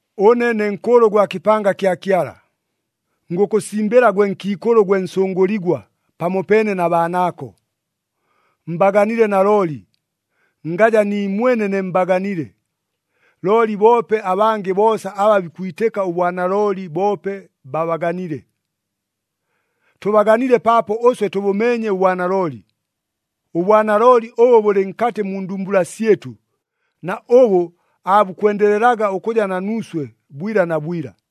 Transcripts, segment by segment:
Ʉne ne nkʉʉlʉ gwa kɨpanga kya Kyala, ngʉkʉsimbɨla gwe nkiikʉlʉ gwe nsʉngʉligwa pamopeene na baanaako. Mbaganile nalooli, ngaja niimwene ne mbaganile, looli boope abangɨ boosa aba bikwitɨka ʉbwanalooli boope babaganile. Tʉbaganile paapo ʉswe tʉbʉmeenye ʉbwanalooli, ʉbwanalooli ʉbʉ bʉlɨ nkatɨ mu ndumbula syɨtʉ na ʉbʉ aabukwendelelaga ʉkʉja na nuuswe bwila na bwila.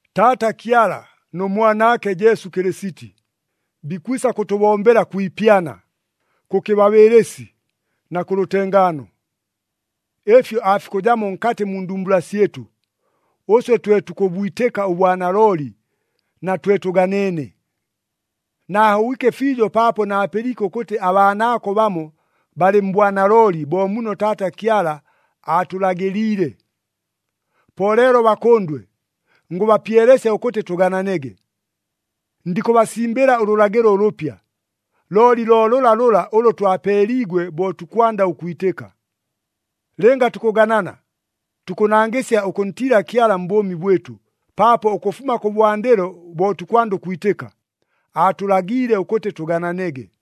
Taata Kyala nʉ Mwanaake Jesu Kɨlɨsiti, bikwisa kʉtʉbombela kwi ipyana, kʉ kɨbabɨɨlɨsi na kʉ lʉtengaano. Ɨfyo aafikʉjamo nkatɨ mu ndumbula syɨtʉ, ʉswe twe tukʉbwitɨka ʉbwanalooli na twe tʉganeene. Naahobwike fiijo paapo naapɨliike ʉkʉtɨ abaanaako bamo balɨ mbwanalooli bo muno Taata Kyala aatʉlagɨliile. Po leelo bakʉndwe, ngʉbapyelesya ʉkʉtɨ tʉgananege. Ndikʉbasimbɨla ʉlʉlagɨlo ʉlʉpya, looli lo lʉlalʉla ʉlʉ twapeeliigwe bo tukwanda ʉkwitɨka. Lɨnga tukʉganana, tukʉnangɨsya ʉkʉntiila Kyala mbʉʉmi bwɨtʉ, paapo ʉkʉfuma kʉbwandɨlo bo tukwanda ʉkwitɨka, aatʉlagiile ʉkʉtɨ tʉgananege.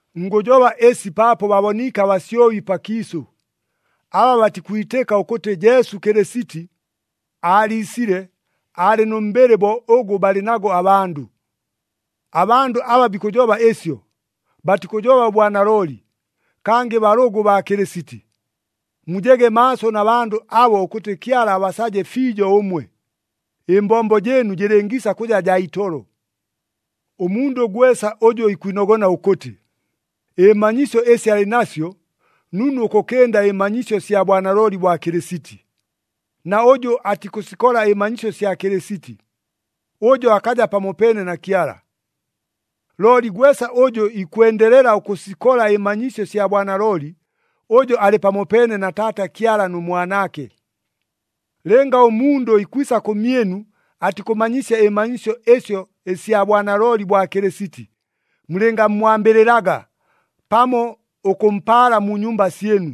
Ngʉjoba ɨsi paapo baboniike abasyobi pakiisʉ, aba batikwitɨka ʉkʉtɨ Jesu Kɨlɨsiti aaliisile aalɨ nʉ mbɨlɨ bo ʉgʉ balɨ nago abandʉ. Abandʉ aba bikʉjoba ɨsyo, batikʉjoba ʉbwanalooli, kangɨ balʉgʉ baa Kɨlɨsiti. Mujege maaso na bandʉ abo ʉkʉtɨ Kyala abasaje fiijo ʉmwe, ɨmbombo jɨɨnu jɨlɨngiisa kʉja jaa itolo. Ʉmundʉ gwesa ʉjʉ ikwinogona ʉkʉtɨ ɨmanyisyo ɨsi alɨ nasyo nunu ʉkʉkɨnda ɨmanyisyo sya bwanalooli bwa Kɨlɨsiti, na ʉjʉ atikʉsikola ɨmanyisyo sya Kɨlɨsiti, ʉjo akaja pamopeene na Kyala. Looli gwesa ʉjʉ ikwendelela ʉkʉsikola ɨmanyisyo sya bwanalooli, ʉjo alɨ pamopeene na Taata Kyala nʉ Mwanaake. Lɨnga ʉmundʉ ikwisa kʉmyɨnu atikʉmanyisya ɨmanyisyo ɨsyo ɨsya bwanalooli bwa Kɨlɨsiti, mulɨngammwambɨlɨlaga pamo ʉkʉmpaala mu nyumba syɨnu.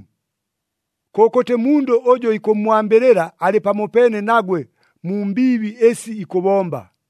Kʉkʉtɨ mundʉ ʉjʉ ikʉmmwambɨlɨla alɨ pamopeene nagwe mu mbiibi ɨsi ikʉbomba.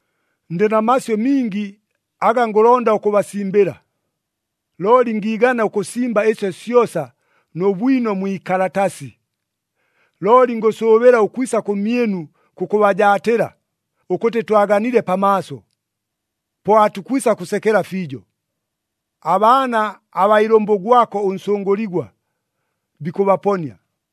Ndɨ na masyʉ mingi aga ngʉlonda ʉkʉbasimbɨla, looli ngiigana ʉkʉsimba ɨsyo syosa nʉ bwino mwi ikalatasi. Looli ngʉsʉʉbɨla ʉkwisa kʉmyɨnu kʉkʉbajaatɨla ʉkʉtɨ twaganile pamaaso. Po aatukwisa kʉsekela fiijo. Abaana abaa ilʉmbʉ gwako ʉnsʉngʉligwa bikʉbaponia.